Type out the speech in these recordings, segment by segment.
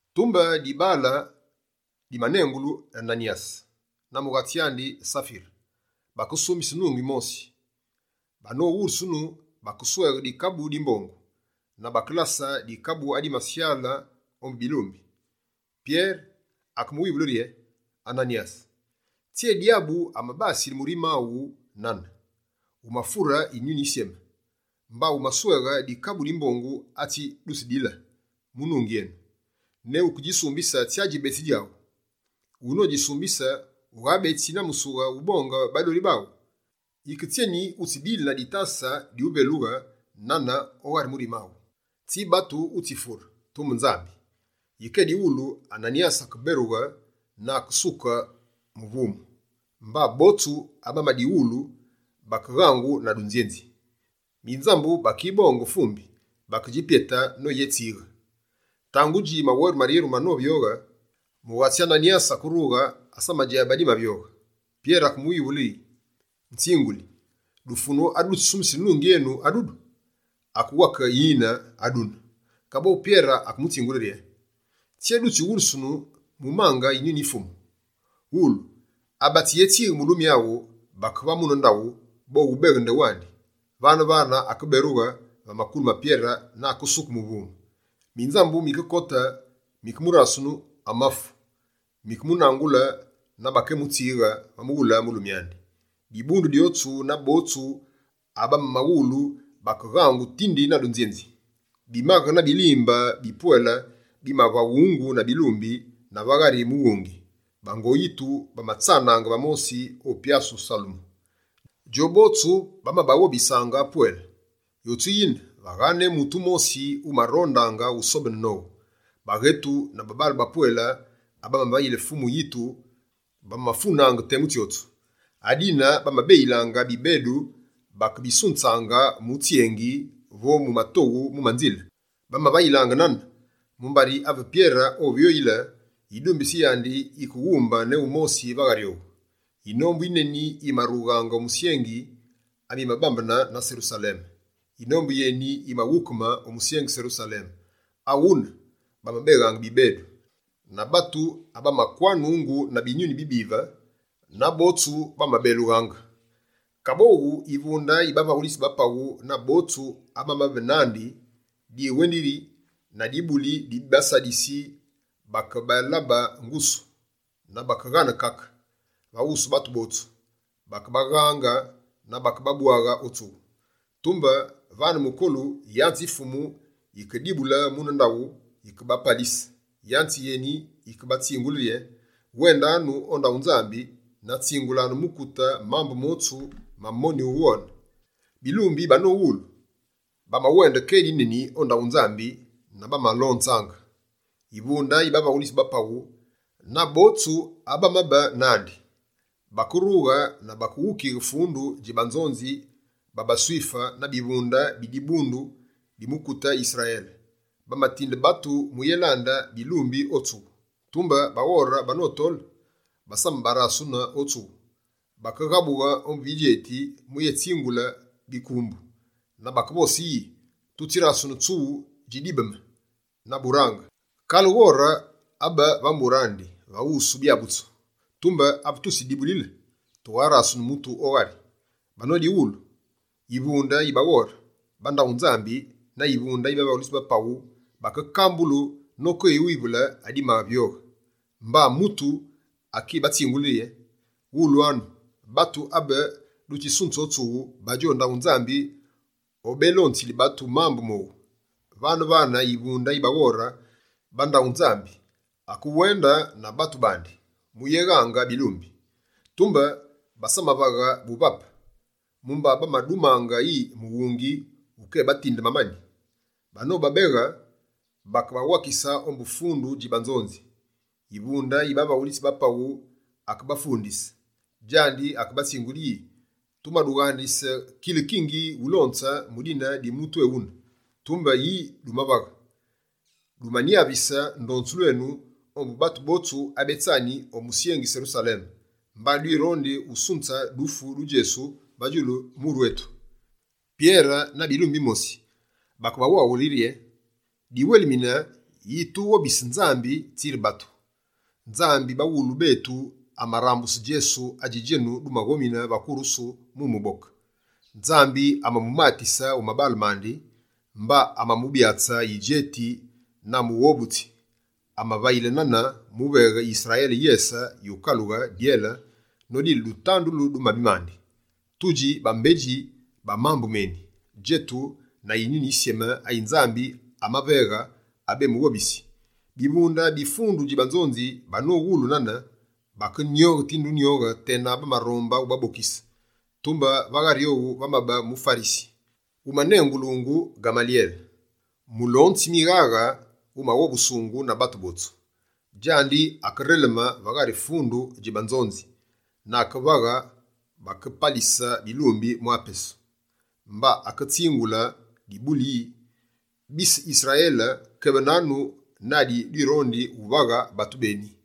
Tumbe dibaale dimanengulungu Ananyase, na mughatsi andi Safire, bakesumbise nungi mosi. Banowulusunu, bakesweghe dikabu di mbongu, na bakelase dikabu adimasyale ombu bilumbi. Pyere akemuwivule rye: «Ananyase, tsyé dyabu amabasile murime aghu nane? Wumafure Yinyuni Yisyeme, mba wumasweghe dikabu di mbongu atsi dutsidile mu nungi enu. Ne wukedjisumbise tsya djibetsi djaghu? Wuno dji sumbise, ughabetsi na musughu wubonge badoli baghu? Yike tsyeni, wutsibile na ditase divelughe nane o ghari murime aghu? Tsi batu wutsifure, tumbe Nzambi!» Yike edighulu, Ananyase akeberughe na akesuke muvumu. Mba botsu abamadiwulu bakeghangu na dunzyenzi. Minzambu bakibonge mvumbi, bakedji pyete noyetswighe. Tangudji maweru maryeru manovyoghe, mughatsi Ananyase akerughe, asamadjabe adimavyoghe. Pyere akemuwivule yi: «Nzinguli, dufunu adu dutsisumbisile nungi enu adudu?» Akewake: «Yine, adune.» Kaboghu Pyere akemutsingule rye: «Tsyé dutsiwulusununu mumange Yinyuni yi Fumu? Wulu! Abatsiyetswighe mulumi aghu, bake va mune ndaghu, bowubeghe ndewandi.» Vane-vane akeberughe va makulu ma Pyere na akesuke muvumu. Minzambu mikekote, mikemurasunu amafu, mikemunangule na bakeyémutswighe va mughule mulumi andi. Dibundu dyotsu na botsu abamamawulu bakeghangu tindi na dunzyenzi. Bimaghe na bilimbe bipwele bimavaghungu na bilumbi va ghari mughungi. Bango yitu bamatsanaange va mosi o Pyasu Salemu. Djobotsu bamabaghobisaange pwele, yotsu yine, vagha ne mutu wumosi wumarondaange wusobene nowu. Baghetu na babaale bapwele, abamavayile Fumu yitu bamafunaange temu tsyotsu. Adine bamabeyilaange bibedu, mba bakebasunzaange mu tsyengi vo mu matoghu mu manzile. Bamavayilaange nane, mumbari ave Pyere ovyoyile, yidumbitsi yandi yikewumbe ne wumosi va ghari owu. Yinombu yineni yimarughaange o misyengi amibambene na Serusaleme. Yinombu yeni yimaghukeme o musyengi Serusaleme. Aghune, bamabeghaange bibedu, na batu abamakwanungu na binyuni bibive, na botsu bamabelughaange. Kaboghu, yivunde yi bavaghulitsi ba paghu na botsu abamabe nandi, diwendi yi na dibuli di baSadisi, bakebalabe ngusu na bakeghane kake. Va wusu batu botsu, bakebaghaange na bakebabwaghe o tsughu. Tumbe, vane mukolu, yanze yi Fumu yikedibule mune ndaghu, yikebapalise. Yanze yeni, yikebatsingule rye: «Wendanu o ndaghu Nzambi, na tsingulanu mukute mambu motsu ma monyu wughone.» Bilumbi banomawulu, bamawende kedi neni o ndaghu Nzambi na bamalonzaange. Yivunde yi bavaghulitsi ba paghu na botsu abamabe nandi, bakerughe na bakeghukighe fundu dji banzonzi ba baSwife na bivunde bi dibundu di mukute Yisrayele. Bamatinde batu muyélande bilumbi o tsughu. Tumbe baghore banotole, basamabarasune o tsughu. Bakeghabughe ombu bidjeti muyebatsingule bikumbu. Na bakevose yi: «Tutsirasene tsughu dji dibeme na burange, kale ghore abe va mbure andi va wusu byabutsu. Tumbe ave tutsidjidibulile, tugharasene mutu o ghari.» Banodighulu, yivunde yi baghore ba ndaghu Nzambi na yivunde yi bavaghulitsi ba paghu bakekambulu nokewivule adimavyoghe. Mba mutu akibatsingule yi: «Wulwanu! Batu abe dutsisunze o tsughu, badji o ndaghu Nzambi obélonzili batu mambu mowu.» Vane-vane yivunde yi baghore ba ndaghu Nzambi akewende na batu bandi muyéghange bilumbi. Tumbe basamavaghe buvape, mumba bamadumange yi mughungi wukébatinde mamani. Banobabeghe, bakebawakise ombu fundu dji banzonzi. Yivunde yi bavaghulitsi ba paghu akebafundise. Djandi akebatsingule yi: «Tumadughandise kile-kingi ulonze mu dine di mutu ewune. Tumbe yi dumavaghe? Dumanyavise ndonzulu enu ombu batu botsu abetsani o musyengi Serusaleme, mba dwirondi usunze dufu du Djesu va djulu muru etu!» Pyere na bilumbi bimosi, bakebawaghule yi: «Diwelimine yi tughobisaange Nzambi, tsiri batu. Nzambi baghulu betu amarambuse Djesu adji djenu dumaghomine va kurusu mu muboke. Nzambi amamumatise o mabaale mandi, mba amamubyatse Yidjeti na Mughobutsi. Amavayile nane, muveghe Yisrayele yese yukalughe dyele nodile dutandu du mabi mandi. Tudji bambedji ba mambu meni, djetu na Yinyuni Yisyeme ayi Nzambi amaveghe abemughobisi.» Bivunde bi fundu dji banzonzi banowulu nane, bakenyoghe tinde unyoghe tena bamaronde ubabokise. Tumbe va ghari owu, vamabe muFarisi wumanengulungu Ghamalyele, mulonzi mighaghe wumaghobusungu na batu botsu. Djandi akereleme va ghari fundu dji banzonzi na akevaghe bakepalise bilumbi mwa temu. Mba aketsingule dibundu yi: «Bise Yisrayele, kebenanu na adi dwirondi uvaghe batu beni bane.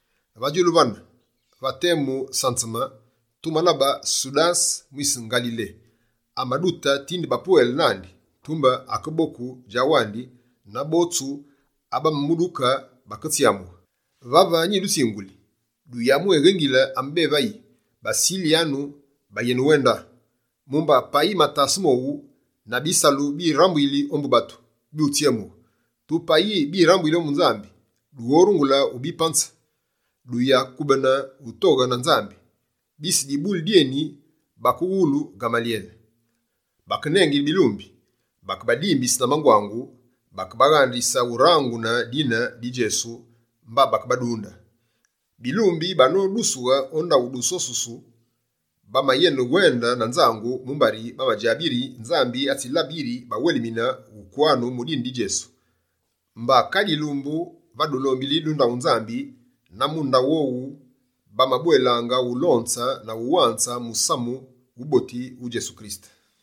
Va djulu vane, va temu sanzeme, tumalabe Sudase mwise Ngalile, amadute tinde bapwele nandi. Tumbe akeboku djawandi, na botsu abamamuduke baketsyamughe. Vave nyidutsinguli: duyamwéghengile ame bévayi, basilyanu bayenewende. Mumba payi matase mowu na bisalu birambuyili ombu batu, byutsyemughe. Tumbe payi birambuyili ombu Nzambi, dughorungule ubipanze. Duyakubene utoghe na Nzambi». Bise dibuli dyeni bakeghululu Ghamalyele. Bakenengile bilumbi, bakebadimbise na mangwangu, bakebaghandise urangune dine di Djesu mba bakebadunde. Bilumbi banodusughe o ndaghu dusosusu. Bamayene wende na nzangu mumbari, bamadjabe yiri Nzambi atsibalabe yi bawelimine ukwanu mu dine di Djesu. Mba kale yilumbu, va dulombili du ndaghu Nzambi na mu ndaghu mowu, bamabwelaange ulonze na uwanze musamu wuboti wu Djesu Kirisete.